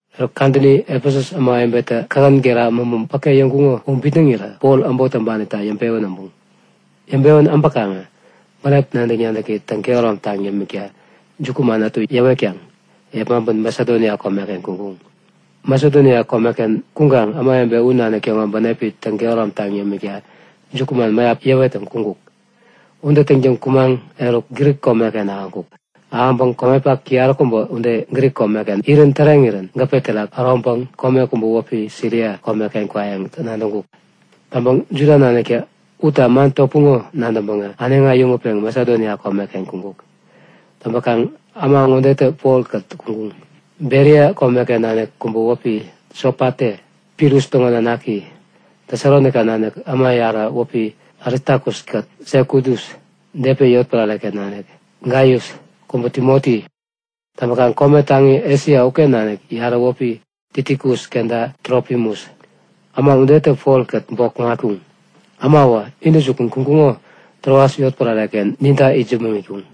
Eruk kadäni Efesus ämawebetä kähän gera mämä päke yäŋkuŋo u bitnäŋirä Pol äbot täŋpanita yäŋpewän äbuŋ. Yäŋpewän äbäkaŋä bänep nadäk-nadäki täŋ-kehäromtaŋ yämikta jukuman ätu yäwetkaŋ yepmaŋpeŋ Masedonia komeken kuŋkuk. Masedonia komeken kuŋkaŋ ämawebe u nanik täŋo bänepi täŋ-kehäromtaŋ yämikta jukuman mäyap yäwettäŋ kuŋkuk. Ude täŋtäŋ kumaŋ eruk, Grik komeken ahäŋkuk. Ahäŋpäŋ komepak yaräkubä ude Grik komeken irän täreŋirän gäpe terak äroŋpeŋ kome kubä wäpi Siria komeken kwayäŋ nadäŋkuk. Täŋpäŋ Juda naniktä utta man topuŋo u nadäŋpäŋä äneŋi äyäŋutpeŋ Masedonia komeken kuŋkuk. Täŋpäkaŋ äma ŋodetä Polkät kuŋkuŋ; Beria komeken nanik kubä wäpi Sopate, Pirus täŋo nanaki, Tesalonaika nanik äma yarä wäpi Aristakus-kät Sekudus, Depe yotpärare-ken nanik Gaius, kubä Timoti. Täŋpäkaŋ kome taŋi Esia uken nanik yarä wäpi Tikikus kenta Trofimus. Äma udetä Polkät bok kuŋatkuŋ. Äma uwä intäjukun kuŋkuŋo Troas yotpärare-ken ninta itsämäŋ itkuŋ.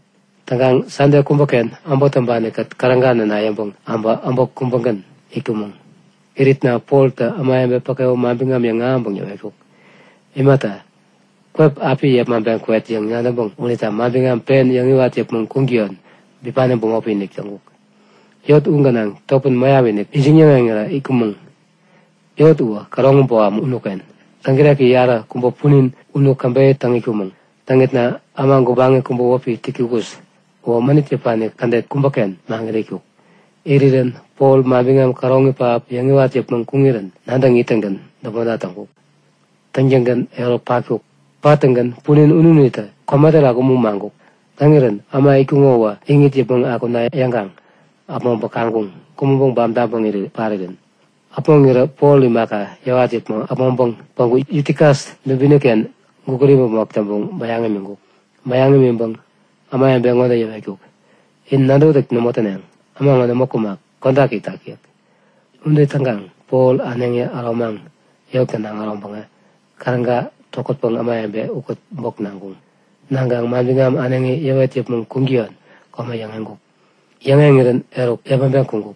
Täŋkaŋ Sande kubäken äbot täŋpani-kät käräga näna yäŋpäŋ äbä äbot kubägän itkumäŋ. Iritna Poltä ämawebe päke u manbiŋam yäŋahäŋpäŋ yäwetkuk. Imata, kwep api yepmaŋpeŋ kwet yäŋ nadäŋpäŋ unita manbiŋam pen yäwet yäpmäŋ kuŋtäyon bipani bämopi-inik täŋkuk. Yot u gänaŋ topän mäyaptä ijiŋ-yäŋeŋirä itkumäŋ. Yot uwä käroŋi boham unuken. Täŋkireki yaräkubä punin unu käbeyä täŋ itkumäŋ. Täŋitna äma gubaŋi kubä wäpi Yutikus uwä mänit yäpani kädet kubäken maŋit itkuk. Irirän Pol manbiŋam käroŋi pähap yäŋiwat yäpmäŋ kuŋirän nadäŋ ittäŋgän däpmonta täŋkuk. Täŋtäŋgän eruk patkuk. Pattäŋgän punin ununitä kome terak umu maŋkuk. Täŋirän äma itkuŋo uwä iŋit yäpmäŋ akuna yäŋkaŋ äpmoŋpäŋ kaŋkuŋ; Kumäŋpäŋ bam täŋpäŋ parirän. Äpmoŋirä Pol imaka, yäwat yäpmäŋ äpmoŋpäŋ päŋku Yutikus dubini-ken gukut imäpmok täŋpäŋ bäyaŋ imiŋkuk. Bäyaŋ imiŋpäŋ ämawebe ŋode yäwetkuk; In nadäwätäk nämo täneŋ. Äma ŋo nämo kumak, kodak itak yäk. Ude täŋkaŋ Pol äneŋi äromaŋ yot gänaŋ äroŋpäŋä käräga tokätpäŋ ämawebe ukät bok naŋkuŋ. Naŋkaŋ manbiŋam äneŋi yäwet yäpmäŋ kuŋtäyon kome yäŋeŋkuk. Yäŋeŋirän eruk yepmaŋpeŋ kuŋkuk.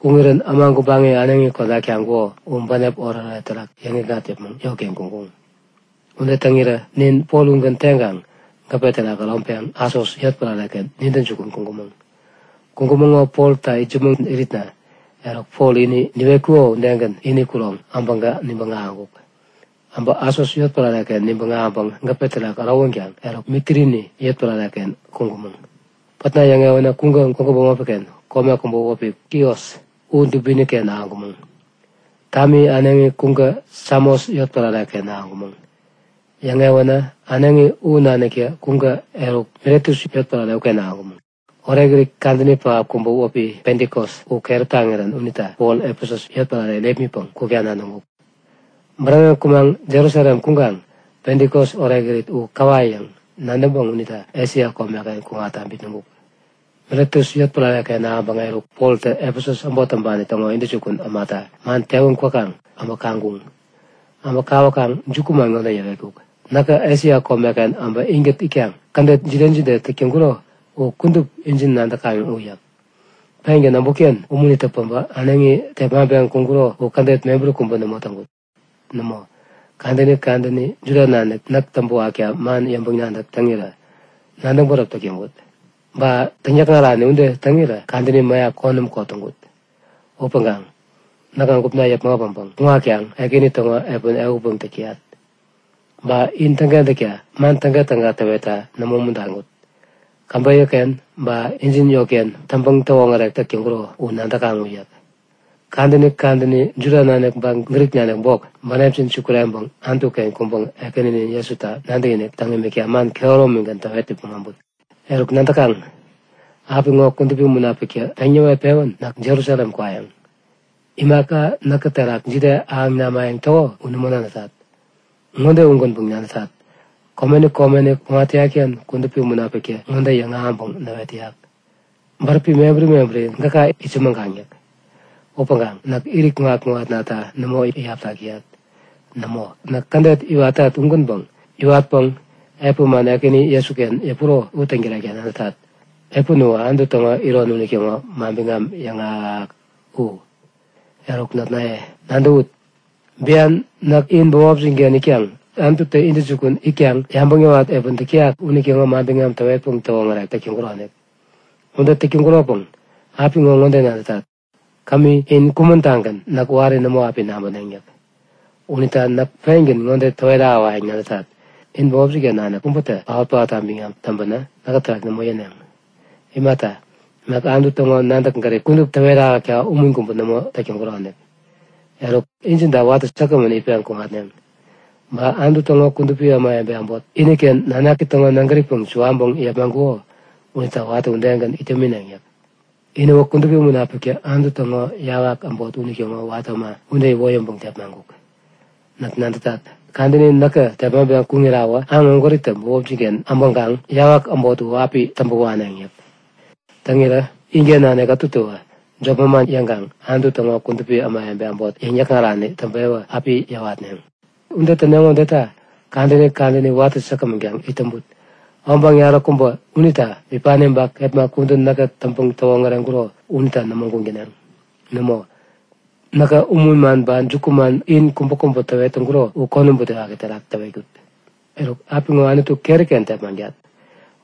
Kuŋirän äma gubaŋi äneŋi kodak taŋkuko u bänep oretoret terak yäŋikŋat yäpmäŋ yotken kuŋkuŋ. Ude täŋirä nin Pol ugän teŋkaŋ gäpe terak äroŋpeŋ Asos yotpärare-ken nintä jukun kuŋkumäŋ. Kuŋkumäŋo Polta itsämäŋ iritna eruk Pol ini niwetkuko udegän ini kuroŋ äbäŋkä nibäŋ ahäŋkuk. Äbä Asos yotpärare-ken nibäŋ ahäŋpäŋ gäpe terak ärowänkaŋ eruk Mitilini yotpärare-ken kuŋkumäŋ. Pätna yäŋewänä kuŋkä gwägu bämopi-ken kome kubä wäpi Kios u dubini-ken ahäŋkumäŋ. Tami äneŋi kuŋkä Samos yotpärare-ken ahäŋkumäŋ. Yäŋewänä äneŋi u naniktä kuŋkä eruk Miletus yotpärare uken ahäŋkumäŋ. Orekirit kadäni pähap kubä wäpi Pentikos u keräp taŋirän unita Pol Efesus yotpärare irepmitpäŋ kukta nadäŋkuk. Bäräŋeŋ kumaŋ Jerusalem kuŋkaŋ Pentikos orekirit u kaŋ käwayäŋ nadäŋpäŋ unita Esia komeken kuŋatta bitnäŋkuk. Miletus yotpärare-ken ahäŋpäŋä eruk Poltä Efesus äbot täŋpani täŋo intäjukun ämata man tewän kwäkaŋ äbä kaŋkuŋ. Äbä kawäkaŋ jukuman ŋode yäwetkuk; Näkä Esia komeken äbä inkät itkaŋ kädet jide jide täk täŋkuro u kudup injin nadäkaŋ u yäk. Pengän äbutken umunitä päbä äneŋi tepmaŋpeŋ kuŋkuro u kädet mebäri kubä nämo täŋkut. Nämo, kadäni kadäni Juda nanik näk täŋpäwakta man yäŋpäŋ-nadäk täŋirä nadäŋ bäräp täk täŋkut. Ba täŋyäkŋarani ude täŋirä kadäni mäyap konäm kot täŋkut. Upäŋkaŋ näkä gupna yäpmäŋ äpäŋpäŋ kuŋatkaŋ Ekäni täŋo epän ehutpäŋ täk täyat. Ba in täŋkentäkta man tägatäga täwetta nämo umuntaŋkut. Käbeyä-ken ba injin yotken täŋpäŋ-täwoŋärek täk täŋkuro, u nadäkaŋ u yäk. Kadäni kadäni Juda nanik ba Grik nanik bok, bänepjin sukureŋpeŋ Anutu-ken kuŋpäŋ Ekäninin Jesuta nadäkinik täŋ imikta man kehäromigän täwet yäpmäŋ äbut. Eruk nadäkaŋ; Apiŋo Kudupi Munapiktä peŋ näwet-pewän näk Jerusalem kwayäŋ. Imaka näkä terak jide ahäŋ namayäŋ täko u nämo nadätat. Ŋode ugänpäŋ nadätat; Komeni komeni kuŋat täyat-ken Kudupi Munapiktä ŋode yäŋahäŋpäŋ näwet täyak; Bäräpi mebäri mebäri gäka itsämäŋkaŋ yäk. Upäŋkaŋ näk irit kuŋat-kuŋatnata nämo iyaptak täyat. Nämo, näk kädet iwatat ugänpäŋ iwatpäŋ epän man Ekäni Jesuken yäpuro u täŋtärekta nadätat. Epän uwä Anutu täŋo iron unitäŋo manbiŋam yäŋahäk-yäŋahäk u. Eruk notnaye, nadäwut. Bian näk in bämopjin-ken itkaŋ Anututä intäjukun itkaŋ yabäŋ yäwat epäni täk täyak unitäŋo manbiŋam täwetpäŋ täwoŋärek täk täŋkuronik. Ude täk täŋkuropäŋ apiŋo ŋode nadätat; Kämi in kumän-tagän näk wari nämo api nabäneŋ yäk. Unita näk pengän ŋode täwet ahäwayäŋ nadätat; In bämopjin-ken nanik kubätä paot-paotta biŋam täŋpänä, näkä terak nämo yäneŋ. Imata, näk Anutu täŋo nadäk-gärip kudup in täwet ahäkta umun kubä nämo täk täŋkuronik. Eruk, in injinta watä säkgämän itpeŋ kuŋatneŋ. Ba Anutu täŋo kudupi ämawebe äbot, iniken nanaki täŋo nägäripäŋ suwaŋpäŋ yepmaŋkuko unita watä udegän it yämineŋ yäk. Inäwä Kudupi Munapiktä Anutu täŋo yawak äbot unitäŋo watä äma ude iwoyäŋpäŋ tepmaŋkuk. Näk nadätat. Kadäni näkä tepmaŋpeŋ kuŋirawä aŋ ägwäritä bämopjin-ken äbäŋkaŋ yawak äbot u api täŋpäwaneŋ yäk. Täŋirä inken nanik ätutäwä jop manman yäŋkaŋ Anutu täŋo kudupi ämawebe äbot yäŋ-yäkŋarani täŋpewä api yäwatneŋ. Ude täneŋo udeta kadäni kadäni watä säkgämän kaŋ it täŋput. Obaŋ yaräkubä unita bipani ba kepma kudän näkä täŋpäŋ-täwoŋäreŋkuro unita nämo guŋ täneŋ. Nämo, näkä umun man ba jukuman in kubäkubä täwet täŋkuro u konäm butewaki terak täwetkut. Eruk, apiŋo Anutu keri-ken tepmaŋtat.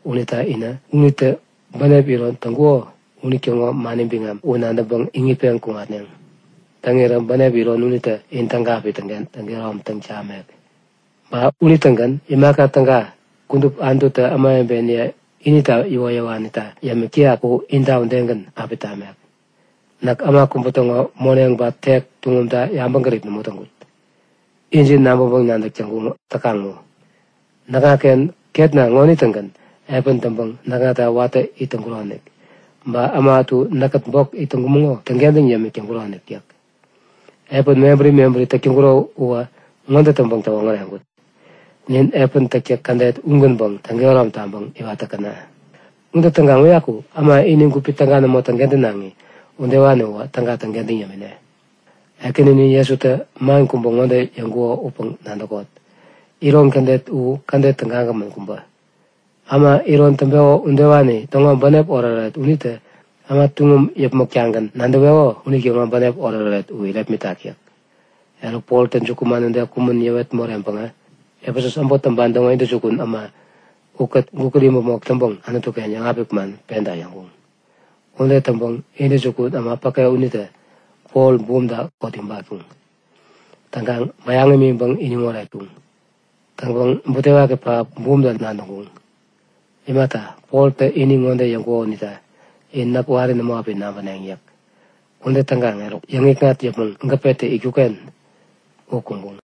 Unita inä unitä bänep iron täŋkuko unitäŋo mani biŋam u nadäŋpäŋ iŋitpeŋ kuŋatneŋ. Täŋirä bänep iron unitä in täga api täŋ-kehäromtaŋ tamek. Ba unitägän imaka täga kudup Anututä ämawebeniye inita iwoyäwanita yämik täyak u inta udegän api tamek. Näk äma kubä täŋo moneŋ ba tek tuŋumta yabäŋgärip nämo täŋkut. Injin nabäŋpäŋ-nadäk täkaŋ u. Näkŋaken ketna ŋonitä-gän epän täŋpäŋ näkŋata watä it täŋkuronik. Ba äma ätu näkkät bok it täŋkumäŋo u täŋkentäŋ yämik täŋkuronik yäk. Epän mebäri mebäri täk täŋkuro uwä ŋode täŋpäŋ-täwoŋäreŋkut; Nin epän täktäk kädet ugänpäŋ täŋkehärom taŋpäŋ iwat täkäna. Ude täŋkaŋ uyaku äma ini gupi täga nämo täŋkentänaŋi udewani uwä täga täŋkentäŋ yämine. Ekäninin Jesutä man kubä ŋode yäŋkuko upäŋ nadäkot; Iron kädet u kädet tägagämän kubä. Äma iron täŋpeko udewani täŋo bänep oretoret unitä äma tuŋum yäpmäk-tagän nadäweko unitäŋo bänep oretoret u irepmitak yäk. Eruk Poltä jukuman ude kumän yäwet moreŋpäŋä Efesus äbot täŋo intäjukun äma ukät gukut imäpmok täŋpäŋ Anutu-ken yäŋapik man penta yäŋkuŋ. Ude täŋpäŋ intäjukun äma päke unitä Pol bumta kot ibatkuŋ. Täŋkaŋ bäyaŋ iŋitpäŋ iniŋ oretkuŋ. Täŋpäŋ butewaki pähap bumta nadäŋkuŋ. Imata, Poltä ini ŋode yäŋkuko unita; In näk wari nämo api nabäneŋ yäk. Ude täŋkaŋ eruk, yäŋikŋat yäpmäŋ gäpetä itkuk-ken u kuŋkuŋ.